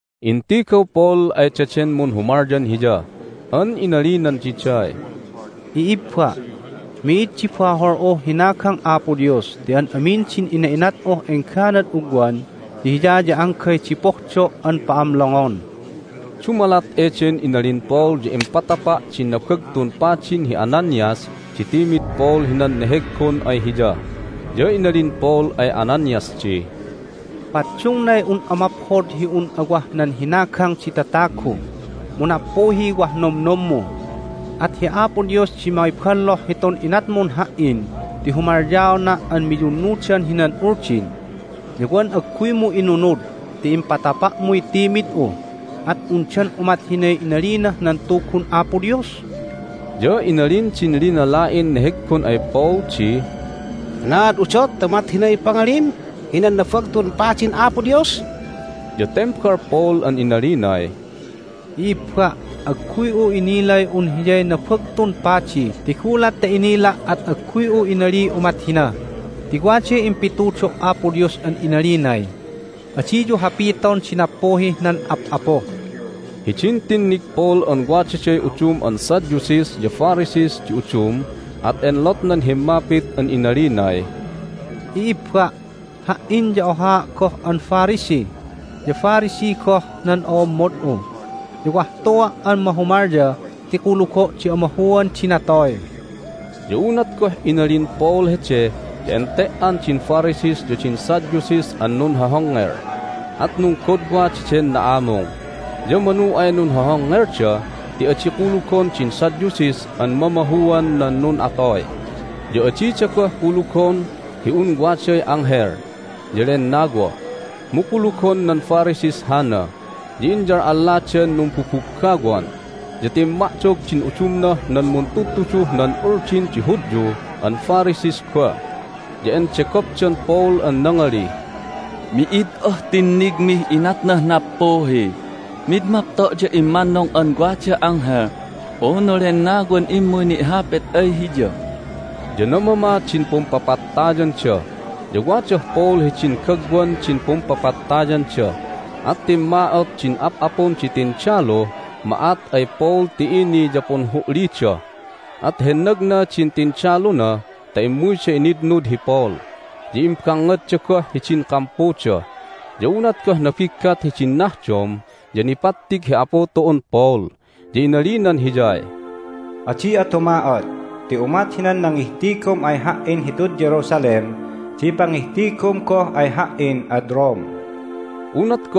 Intigaw Paul ay daden munhumalyan hiya an inalinan diday, "I'ibba', mi'id di bahol'uh hinagang Apo Dios ti an amin din ina'inat'uh engganad ugwan ya Hiya ya anggay di pohdo' an pa'amlongon." Dumalat eden inalin Paul ya impatapa' din Nabagtun Padin hi Ananias di timid Paul hinan neheggon ay hiya. Ya inalin Paul ay Ananias di, "Paddungnay un'a maphod hi un'a wah nan hinagang di tatagu, mu nappuhiy wah nomnommu! At hi Apo Dios di mangiballoh hitun inatmun ha"in ti humalyaona' an miyunnudan hinan Uldin, ya wan agguymu inunud ti impatapa'muy timid'u! At undan umat hinay inalinah nan Tugun Apo Dios?" Ya inalin din linala'in neheggon ay Paul di, "Anaad udot ta umat hinay pangalim hinan Nabagtun Padin Apo Dios?" Ya tembal Paul an inalinay, "I'ibba', agguy'u inilay un hiyay Nabagtun Padi ti gulat ta inila' at agguy'u inaliy umat hina. Ti waday impitudo' Apo Dios an inalinay, Adiyu hapiton di nappuhih nan ap'apu." Hidin tinnig Paul an wadaday udum an Sadducees ya Pharisees di udum at enlotnan himmapit an inalinay, "I'ibba', ha"in ya ohaa' goh an Pharisee, ya Pharisee goh nan o'ommod'u! Ya wah tua' an mahumalya ti kulugo' di amahuan di natoy!" Ya unat goh inalin Paul hede ya ente"an din Pharisees ya din Sadducees an nunhohongngel, at nunggodwa daden na'amung. Ya manu ay nunhohongngelda ti adi kulugon din Sadducees an mamahuan nan nun'atoy, ya adida goh kulugon hi un waday anghel ya lennawa, mu kulugon nan Pharisees hana. Ya inyal'alladan numbubuggawan. Ya timma'dog din udumnah nan muntudtuduh nan Uldin di Hudyu an Pharisees goh, ya endegopdan Paul an nangalih, "Mi'id ah tinnigmih inatnah nappuhi! Mid mapto' ya immannung an waday anghel unu lennawan immuy ni'hapit ay hiya!" Ya namama din pumpapattayanda, ya wadah Paul hidin gagwan din pumpapattayanda. At timma'ot din ap'apun di tindaluh ma'at ay Paul ti ini ya punhu'lida. At hennagna din tindaluna ta immuyda initnud hi Paul, ya imbangngadda goh hidin kampuda. Ya unat goh nabiggat hidin nahdom ya nipattig hi Apu tu'un Paul, ya inalinan hiyay, "Adi'a tuma'ot ti umat hinan nangihtigum ay Ha"in hitud Jerusalem di pangihtigum goh ay Ha"in ad Rome." Hay Nunhahapitan nan Hudyuh Pamatayandan Paul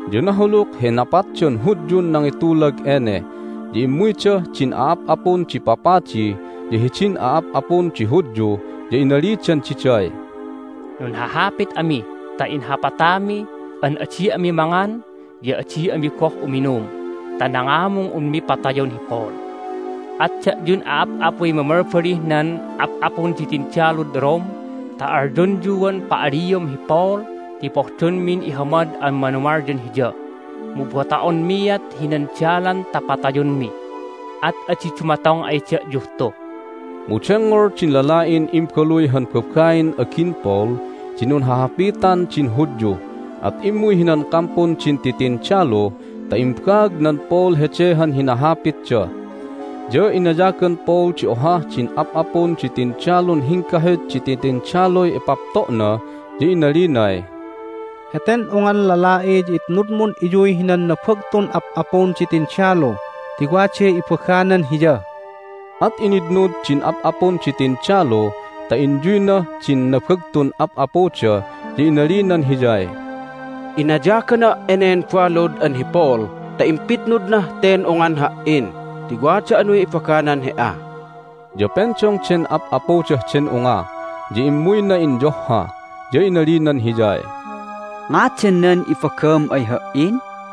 Ya nahuluk hi napatdan Hudyun nangitulag ene. Ya immuydah din a'ap'apun di papadi ya hidin a'ap'apun di Hudyu, ya inalidan diday, "Nunhahapit ami ta inhapatami an adi ami mangan ya adi ami goh uminum ta nangamung unmi patayon hi Paul. At da'yun a'ap'apuy mamalbalih nan ap'apun di tindalud Rome ta alyonyuan pa'aliom hi Paul ti pohdonmin ihamad an manumalyan hiya. Mu bota'onmiat hinan dalan ta patayonmi, at adi dumatong ay da'yuh tu." Mu dengngol din lala'in imbaluy han babain agin Paul di nunhahapitan din Hudyu, at immuy hinan kampun din titindalu ta imbaagnan Paul hede han hinahapitda. Ya inayagan Paul di ohah din ap'apun di tindalun hinggahut di titindaluy ipapto'na, ya inalinay, "Heten ungan lala'i ya itnudmun iyuy hinan nabagtun ap'apun di tindalu ti waday ibaganan hiya." At initnud din ap'apun di tindalu ta inyuynah din nabagtun ap'apuda, ya inalinan hiyay, "Inayagana' enen balud an hi Paul ta impitnudnah ten ungan ha"in ti wada anuy ibaganan he"a." Ya pendong den ap'apudah den unga, ya immuyna inyohha, ya inalinan hiyay, "Ngadan nan ibagam ay ha"in?"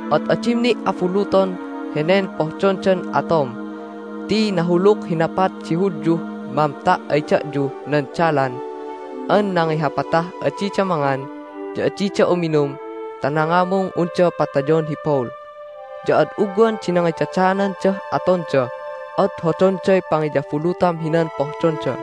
At adim ni' abuluton henen pohdondan atom ti nahuluk hi napat di Hudyuh mamta' ay da'yuh nan dalan an nangihapatah adida mangan ya adida uminum ta nangamung unda patayon hi Paul. Ya ad ugwan di nangidadaanandah atonda, at hodonday pangiyabulutam hinan pohdonda."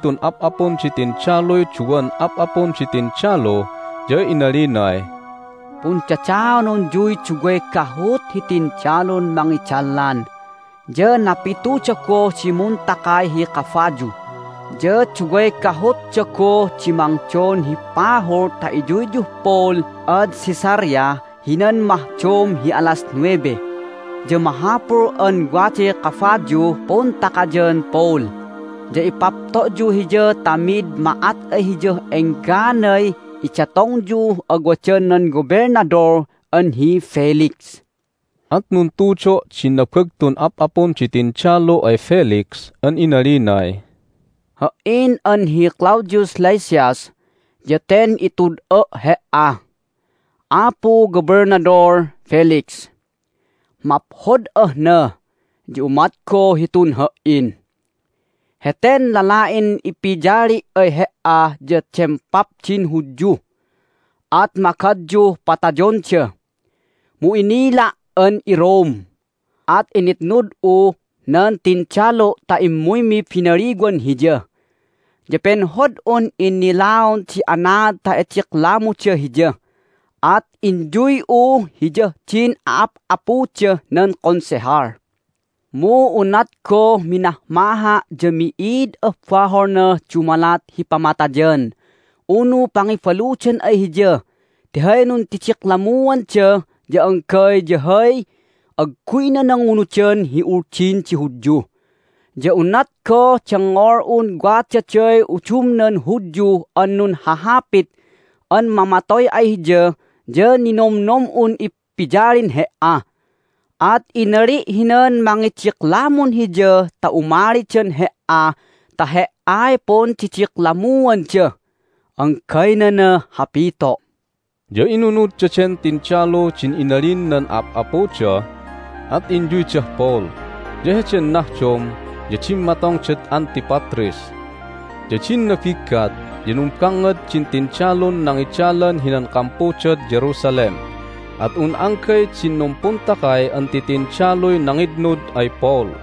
Impa'ayag din nabagtun ap'apun di tindaluy duwan ap'apun di tindalu, ya inalinay, "Pundadaanonyuy duway gahut hi tindalun mangidalan, ya napituda goh di muntakay hi kabayu, ya duway gahutda goh di mangdon hi pahul ta iyuyyuh Paul ad Caesarea hinan mahdom hi alas nuwebe. Ya mahapul an waday kabayuh puntakayan Paul, ya ipapto'yu hiya ta mid ma'at ay hiyah engganay idatongyuh awadan nan Gobelnadol an hi Felix." At nuntudo' din nabagtun ap'apun di tindalu ay Felix an inalinay, "Ha"in an hi Claudius Lysias, ya ten itud'a' he"a, Apu Gobelnadol Felix. Maphod'ah na, ya umat goh hitun ha"in. Heten lala'in ipiyali' ay he"a ya dempap din Hudyu, at magadyuh patayonda, mu inila' an iRome, at initnud'u nan tindalu' ta immuymi binaliwan hiya. Ya penhod'un innilaon di anaad ta idiklamuda hiya, at inyuy'u hiyah din a'ap'apudah nan Konsehal. Mu unat goh minahmaha' ya mi'id ah baholnah dumalat hi pamatayan unu pangibaludan ay hiya ti hay nundidiklammuanda ya anggay ya hay agguyna nangunudan hi Uldin di Hudyu. Ya unat goh dengngol'un wadaday udumnan Hudyu an nunhahapit an mamatoy ay hiya ya ninomnom'un ipiyalin he"a. At inali' hinan mangidiklamun hiya ta umalidan he"a ta he"ay pundidiklammuanda. Anggaynanah hapito'." Ya inunud daden tindalu din inalin nan ap'apuda, at inyuydah Paul. Ya heden nahdom ya dimmatongdad Antipatris. Ya din nabiggat ya numbangngad din tindalun nangidalan hinan kampudad Jerusalem, at un anggay din numpuntakay an titindaluy nangitnud ay Paul.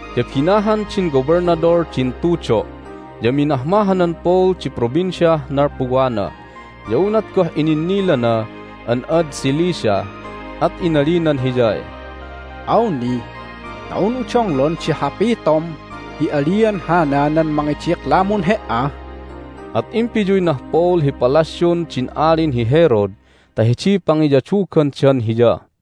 Ya binahan din gobelnadol din tudo', ya minahmahanan Paul di provinciah nalpuwana. Ya unat goh ininnilana an ad Cilicia at inalinan hiyay, "Awni ta un'u donglon di hapitom hi alian hana nan mangidiklamun he"a." At impiyuynah Paul hi palasyun din Alin hi Herod ta hidiy pangiyadugandan hiya.